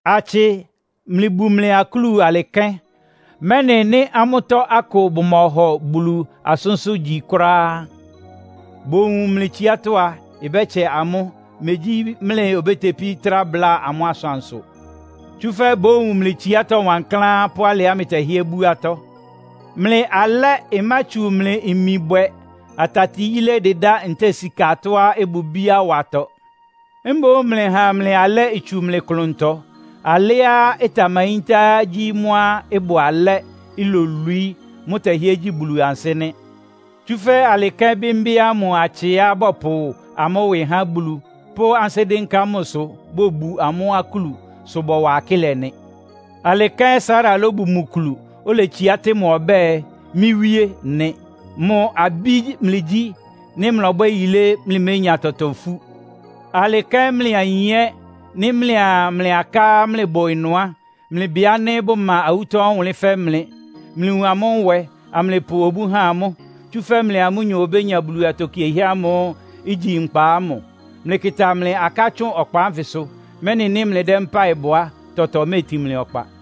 Atsɩ, mlɩbu mlɩ akúlu alɩ kɛ́n, mɛ́nɩ nɩ́ amʋ́tɔ́ akʋ bʋmɔhɔ Bulu asʋ́nsʋ́ gyi kʋ́ráá, bowun mlɩ tsiátɔ́ a, ɩbɛ́tsɛ amʋ́, megyí mlɩ obétepí trá bláa amʋ́ asʋansʋ. Tsúfɛ́ bówun mlɩ tsiátɔ́ wankláán pʋ́ alɩá mlɩtɛhɩ́ɛ́ bú atɔ́. Mlɩ alɛ́ ɩmátsu mlɩ imi bwɛ, atati yílé dɩdá ntɛ́ɛ sika atɔ́á ɩbʋ ibíá watɔ. Mboún mlɩha mlɩ alɛ́ itsu mlɩ klʋntɔ. Alɛ́á ɩtamayíntá gyí mʋ́á ɩbʋ alɛ́, ilolwií. Mʋ́tɛhɩ́ɛ́ gyi Bulu ansɩ́ nɩ́. Tsúfɛ́ alɩ kɛ́n bɩ́mbɩ́ ámʋ atsɩá bɔpʋ amʋ́ ɩwɩ há Bulu, pʋ́ ansɩ́ dɩ́nká mʋsʋ bobu amʋ́ akúlu, sʋ bɔwa akɩ́lɛ nɩ. Alɩ kɛ́n Sara lóbu mʋ kulu, oletsiá tɩ́ mʋ ɔbɛ́ɛ, “Mɩ́ wíe” nɩ. Mʋ abí mlɩgyí, nɩ́ mlɔbwɛ́ yilé, mlɩménya tɔtɔ ifú. Alɩ kɛ́n mlɩ ayin ɛ́, nɩ́ mlɩa mlɩ aká mlɩbʋ ɩnʋ á, mlɩbɩ ánɩ́ bʋma awútɔ́ ɔwʋnlɩ́n fɛ́ mlɩ. Mlɩwun amʋ́ nwɛ, amlɩpʋ obú ha amʋ́. Tsúfɛ́ mlɩa amʋ́nyɔ obénya Bulu atokiehɛ́ ámʋ́ʋ́ igyi nkpa ámʋ. Mlɩkɩta mlɩ aká tsʋn ɔkpa ánfɩsʋ, mɛ́nɩ nɩ́ mlɩdɛ́ mpáɩ bɔ á, tɔtɔ méetin mlɩ ɔkpa.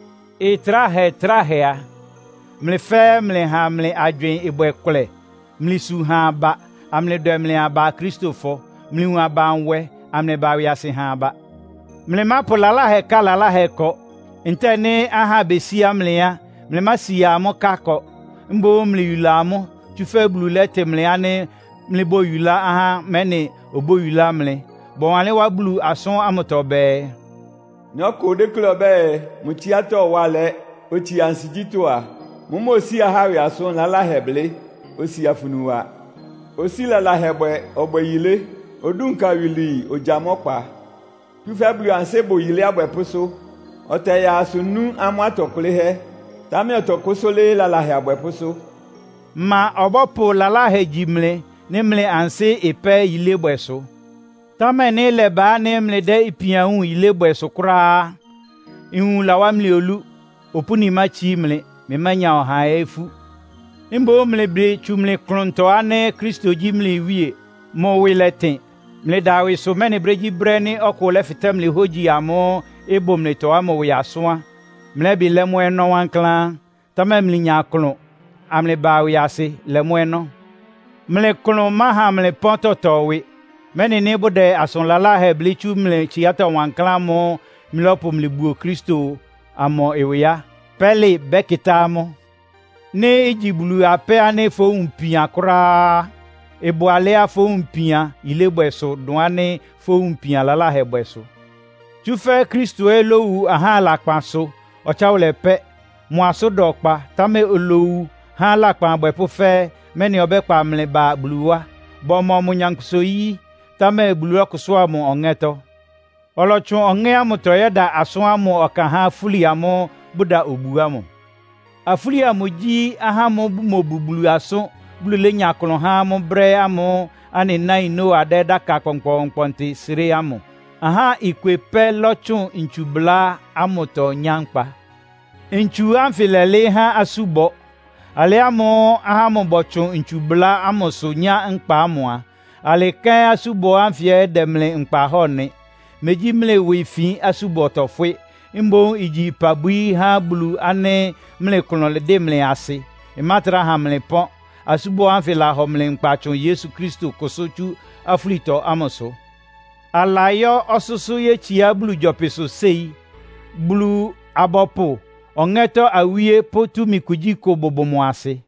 Ɩtráhɛ-tráhɛ a, mlɩ fɛ́ɛ́ mlɩha mlɩ agywɩɩn ɩbwɛ kʋlɛ. Mlɩsu ha aba, amlɩdwɛ mlɩ aba Akristofɔ. Mlɩwun aba nwɛ, amlɩba ɩwɩasɩ ha aba. Mlɩmápʋ lalahɛ ká lalahɛ ɩkɔ. Ntɛ́ɛ nɩ́ ahá besíá mlɩ á, mlɩmásia amʋ́ ká ɩkɔ. Mboún mlɩyula amʋ́, tsúfɛ́ Bulu lɛ́tɩ mlɩ ánɩ́ mlɩbóyulá ahá, mɛ́nɩ obóyulá mlɩ. Bɔwanlɩ́n wá Bulu asʋ́n ámʋtɔ bɛɛ, “Nɩ́ ɔkʋ déklé ɔbɛ́ɛ, mʋ tsiátɔ́ ɩwá alɛ́, otsia ansigyítɔ́ a, mʋ́mʋ́ osíi ahá ɩwɩ asʋn laláhɛ blɩ́, osi afunu wa. Osíi lalahɛ bwɛ, ɔbwɛ́ɛ yilé. Odúnka iwilwii, ogyáa mʋ́ ɔkpa. Tsúfɛ́ Bulu ansɩ́ bʋ yilé abwɛpʋ́sʋ́. Ɔtɛyaa asʋ nú amʋ́ atɔ kʋlɩ́hɛ́. Támɛ ɔtɔkʋ́sʋ́ lɩ́ɩ́ lalahɛ abwɛpʋ́sʋ́.” Ma ɔbɔ́pʋ lalahɛ gyi mlɩ, nɩ́ mlɩ ansɩ́ ɩpɛ́ yilébwɛsʋ? Támɛ nɩ́ ɩlɛba ánɩ́ mlɩdɛ́ ipianwúun yilébwɛ sʋ kʋ́ráá á, nwun láwá mlɩ olú. Opúni mátsií mlɩ, mlɩmánya ɔhaa ɛ́ ifú. Mboún mlɩbɩ tsu mlɩ klʋntɔ ánɩ́ Kristo gyí mlɩ Wíe, mʋ ɩwɩ lɛtɩn. Mlɩda ɩwɩsʋ, mɛ́nɩ brégyíbrɛ́ nɩ́ ɔkʋ lɛ́fɩtɛ́ hógyi ámʋ́ʋ́ ɩbʋ mlɩtɔ ámʋ ɩwɩ asʋ́n á, mlɛ́bɩ lɛ́ mʋ́ ɔnɔ́ wankláán. Támɛ mlɩnya klʋn, amlɩba ɩwɩasɩ lɛ mʋ́ ɔnɔ́. Mlɩ klʋn máha mlɩ pɔ́n tɔtɔ ɩwɩ, mɛ́nɩ nɩ́ bʋdɛ asʋn laláhɛ blɩ́ tsú mlɩ tsiátɔ́ wankláán ámʋ́ʋ́ mlɩlɔ́pʋ mlɩbuo Kristo amʋ ɩwɩ á, pɛ́lɩ bɛ́kɩtá amʋ́. Nɩ́ igyi Bulu apɛ́ ánɩ́ fʋwúun ipian kʋ́ráá á, ɩbʋ alɛ́á fówun ipian yilébwɛ sʋ, dʋn ánɩ́ fówun ipian lalahɛbwɛ sʋ. Tsúfɛ́ Kristo ɛ́ lówu ahá lakpan sʋ ɔtsáwʋlɛ pɛ́. Mʋ asʋ́n da ɔkpa, támɛ olowu há lakpan abwɛpʋ́ fɛ́ɛ́, mɛ́nɩ ɔbɛ́kpa mlɩ ba Bulu wá. Bɔmɔ mʋ nyankpʋsa-oyí, támɛ Bulu lɔ́kʋsʋ́a mʋ Ɔŋɛ́tɔ́. Ɔlɔtsʋn Ɔŋɛ́ ámʋtɔ yɛ́da asʋ́n ámʋ ɔkan há afúli amʋ́ʋ́ bʋda obu ámʋ. Afúli amʋ gyí, ahá ámʋ́ʋ́ bʋmobu Bulu asʋ́n, Bulu lénya klʋn há amʋ́ brɛ́ ámʋ́ʋ́ anɩ náin Noa dɛ́ dáka kpɔnkpɔɔnkpɔntɩ sré ámʋ. Ahá ikwe pɛ́ lɔ́tsʋn ntsubʋlá ámʋtɔ nyá nkpa. Ntsu ánfɩ lɛ́lɩɩ́ há asúbɔ. Alɩ ámʋ́ʋ́ ahá ámʋ bɔtsʋn ntsubʋlá ámʋsʋ nyá nkpa ámʋ a, alɩ kɛ́n asúbɔ ánfɩ dɛ́ mlɩ nkpa hɔ́ɔ nɩ. Megyí mlɩ ɩwɩ ifin asúbɔ tɔfwɩ́. Mboún igyi ɩpabwií há Bulu ánɩ́ mlɩ klʋn ɩdɩ́ mlɩ asɩ, ɩmátrá ha mlɩ pɔ́n. Asúbɔ ánfɩ lahɔ mlɩ nkpa tsʋn Yesu Kristo kʋsʋ́ tsú afúlitɔ ámʋsʋ. Alayɔ́ ɔsʋ́sʋ́ yétsiá Bulu gyɔpɩsʋ séi. Bulu-abɔpʋ, ɔŋɛ́tɔ́ awíe pʋ́ túmi kugyíkʋ bʋbʋ mʋ asɩ.